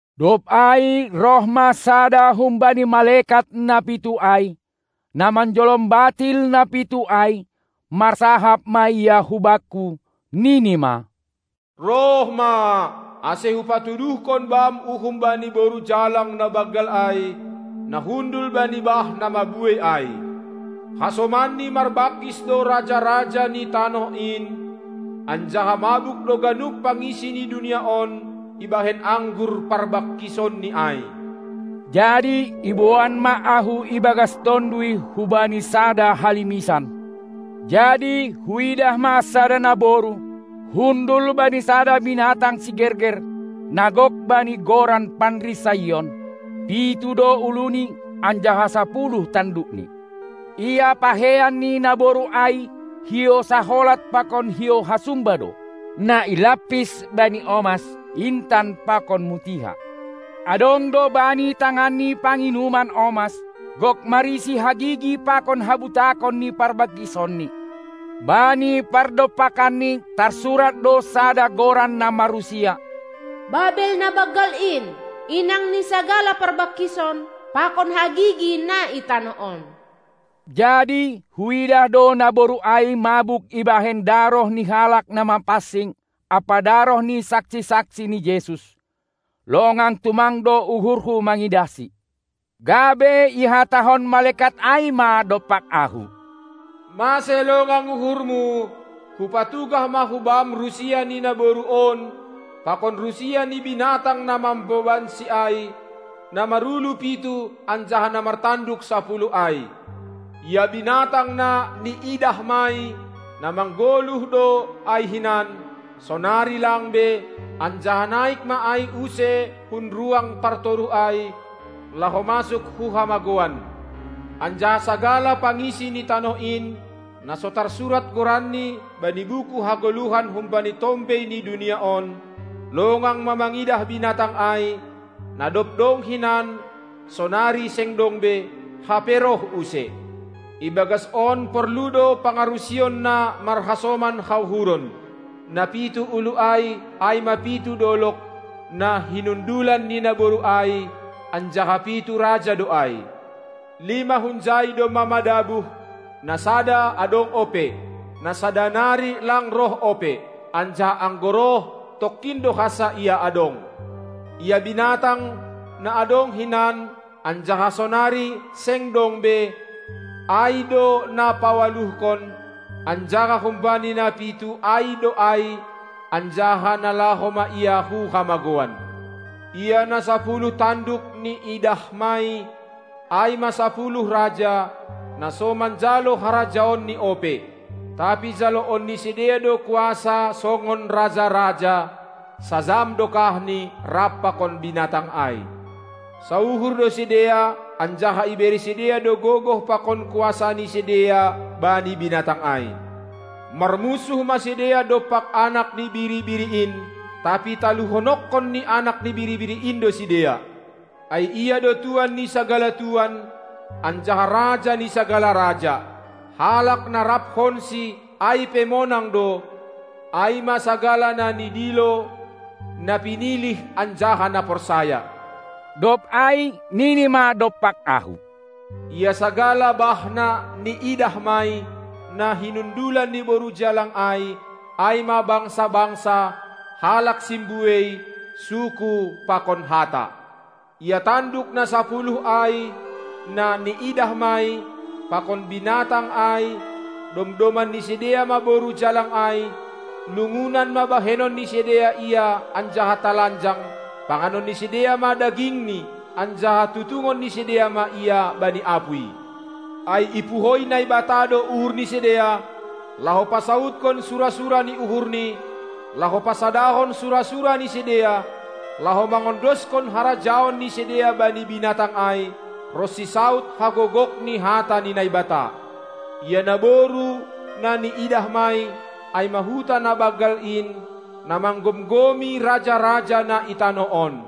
Dob ai roh ma sada humbani malekat na pitu ai, na manjolom batil na pitu ai, marsahap ma ia hubakku, nini ma: Roh ma, ase hupatuduhkon bam uhum bani boru jalang na banggal ai, na hundul bani bah na mabuei ai. Hasomanni marbangkis do raja-raja ni tanoh in, anjaha mabuk do ganup pangisi ni dunia on ibahen anggur parbangkisonni ai. Jadi iboan ma ahu ibagas tonduy hubani sada halimisan. Jadi huidah ma sada naboru, hundul bani sada binatang sigerger, na gok bani goran panrisaion, pitu do uluni anjaha sapuluh tandukni. Ia pakeian ni naboru ai hiou saholat pakon hiou hasumba do, na ilampis bani omas, intan pakon mutiha; adong do bani tanganni panginuman omas, gok marisi hagigi pakon habutakon ni parbangkisonni. Bani pardompakanni tarsurat do sada goran na marrusia: Babel na banggal in, inang ni sagala parbangkison pakon hagigi na i tanoh on. Jadi huidah do naboru ai mabuk ibahen daroh ni halak na mapansing ampa daroh ni saksi-saksi ni Jesus. Longang tumang do uhurhu mangidahsi. Gabe ihatahon malekat ai ma dompak ahu: Mase longang uhurmu? Hupatugah ma hubam rusia ni naboru on pakon rusia ni binatang na mambobansi ai, na marulu pitu anjaha na martanduk sapuluh ai. Ia binatang na niidahmai, na manggoluh do ai hinan, sonari lang be, anjaha naik ma ai use hun ruang partoruh ai, laho masuk hu hamagouan; anjaha sagala pangisi ni tanoh in, na so tarsurat goranni bani buku hagoluhan humbani tombei ni dunia on, longang ma mangidah binatang ai, na dob dong hinan, sonari seng dong be, hape roh use. Ibagas on porlu do pangarusion na marhasoman hauhuron! Na pitu ulu ai, ai ma pitu dolog, na hinundulan ni naboru ai, anjaha pitu raja do ai. Lima hunjai domma madabuh, na sada adong ope, na sada nari lang roh ope; anjaha anggo roh, tongkin do hansa ia adong. Ia binatang, na adong hinan, anjaha sonari seng dong be, ai do na pawaluhkon, anjaha humbani na pitu ai do ai, anjaha nalaho ma ia hu hamagouan. Ia na sapuluh tanduk niidahmai, ai ma sapuluh raja, na so manjalo harajaonni ope. Tapi jaloon ni sidea do kuasa songon raja-raja sajam dokahni rap pakon binatang ai. Sauhur do sidea anjaha ibere sidea do gogoh pakon kuasa ni sidea bani binatang ai. Marmunsuh ma sidea dompak Anak ni Biri-biri in, tapi taluhononkon ni Anak ni Biri-biri in do sidea; ai Ia do tuan ni sagala tuan anjaha Raja ni sagala raja. Halak na raphonSi ai pe monang do, ai ma sagala na nidilo, na pinilih anjaha na porsaya. Dob ai nini ma dompak ahu: Ia sagala bah na niidahmai, na hinundulan ni boru jalang ai, ai ma bangsa-bangsa, halak simbuei, suku pakon hata. Ia tanduk na sapuluh ai, na niidahmai, pakon binatang ai, domdoman ni sidea ma boru jalang ai, lungunan ma bahenon ni sidea ia anjaha talanjang, panganon ni sidea ma dagingni, anjaha tutungon ni sidea ma ia bani apuy. Ai ipuhoi Naibata do uhur ni sidea, laho pasaudkon sura-sura ni uhurNi, laho pasadahon sura-sura ni sidea, laho mangondoshon harajaon ni sidea bani binatang ai, ronsi saud hagogok ni hata ni Naibata. Ia naboru, na niidahmai, ai ma huta na banggal in, na manggomgomi raja-raja na i tanoh on.